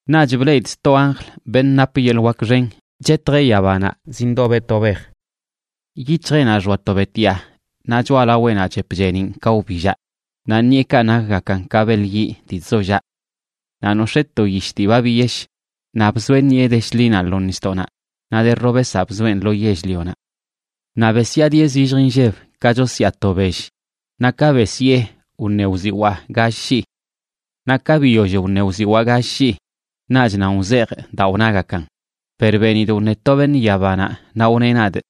Naꞌch bleꞌidꞌ sto anjl, beṉꞌ nap yeḻꞌ wak xen, chetjeꞌ yabanaꞌ zindobeꞌ to bej. Yic̱hjeꞌnaꞌ xoa to betyaa, naꞌ choꞌalaweꞌnaꞌ chep cheeniꞌn ka wbillaꞌ, naꞌ ṉiꞌekaꞌ nakgakan ka beḻ yiꞌ dii chzollaꞌ. Naꞌ nox̱ee to yish dii ba biyesh, naꞌ bzoeꞌ ṉiꞌe de shḻinaꞌ lo nisdoꞌnaꞌ naꞌ de robesaꞌ bzoeꞌn lo yell-lionaꞌ. Naꞌ besyaadieꞌ zillj inlleb ka chosyaa to bell. Naꞌ ka besyee, wṉe wziwaa gall shii. Naꞌ ka biyoll wṉe wziwaa gall shii, naꞌch nan wzejꞌ daa wnagakan. Per benidꞌ wṉe to beṉꞌ yabanaꞌ, naꞌ wneꞌ nadꞌ: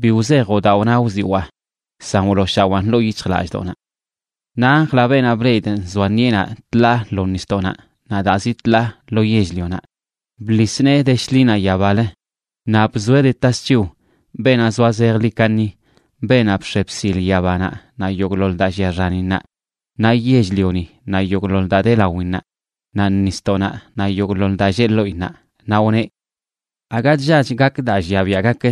―Bi wzejoꞌ daa wna wziwaa, san wlooshawaan ḻoo yic̱hjlallꞌdoꞌnaꞌ. Naꞌ anjlaꞌ, beenaꞌ bleꞌidꞌ nzoa ṉiꞌenaꞌ tḻaa lo nisdoꞌnaꞌ naꞌ daa zi tḻaa lo yell-lionaꞌ, bḻis nee de shḻinaꞌ yabalə naꞌ bzoeꞌ de tasc̱hiw beenaꞌ zoa zejḻi kaṉi, beenaꞌ bx̱e bsil yabanaꞌ naꞌ yogꞌḻoḻ daa llia xaninnaꞌ, naꞌ yell-lioni naꞌ yogꞌḻoḻ daa de lawinnaꞌ, naꞌ nisdoꞌnaꞌ naꞌ yogꞌḻoḻ daa lleꞌ ḻoꞌinnaꞌ, naꞌ wneꞌ: ―Aga chllach gak daa llia biaꞌ gak.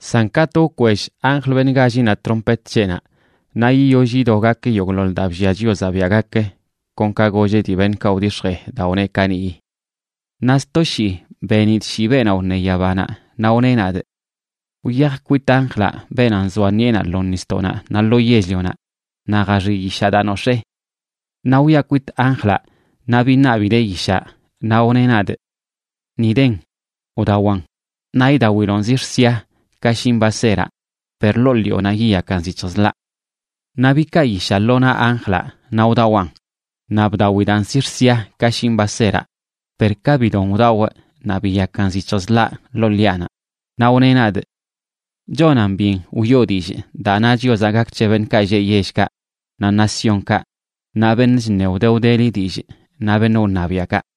San katꞌ wkwell anjl, beṉꞌ gállinaꞌ, trompet c̱heꞌnaꞌ, naꞌ yiyoll yido gak yogꞌḻoḻ daa bllia Chiozaꞌ biaꞌ gak, kon ka golleꞌ dii beṉꞌkaꞌ wdix̱jee daa wneꞌ kaniꞌyi. Naꞌ sto shii benidꞌ shii beenaꞌ wṉe yabanaꞌ, naꞌ wneꞌ nadꞌ: ―Wyaj kwit anjlaꞌ, beenaꞌ nzoa ṉiꞌenaꞌ lo nisdoꞌnaꞌ naꞌ lo yell-lionaꞌ, naꞌ jaxiꞌ yishaꞌ daa nox̱ee. Naꞌ wyaꞌ kwit anjlaꞌ naꞌ biṉabidee yishaꞌ. Naꞌ wneꞌ nadꞌ: ―Ni den, wdawan. Naꞌ idawilonꞌ zix̱ sia ka shin baseraꞌ, per ḻoo ḻiꞌonaꞌ yiyakan zic̱hj zḻaꞌ. Naꞌ bikaa yishaꞌ lo naꞌ anjlaꞌ naꞌ wdawaꞌn. Naꞌ bdawidaan zix̱ sia ka shin baseraꞌ, per ka bidon wdawꞌ naꞌ biyakan zic̱hj zḻaꞌ ḻoo ḻiꞌanaꞌ. Naꞌ wneꞌ nadꞌ: ―Chonan byen wiꞌo dillꞌ daa na Chiozaꞌ gak c̱he beṉꞌkaꞌ lleꞌ yellkaꞌ, naꞌ naciónkaꞌ, naꞌ beṉꞌ chṉe wde wdeli dillꞌ, naꞌ beṉꞌ wṉabiaꞌkaꞌ.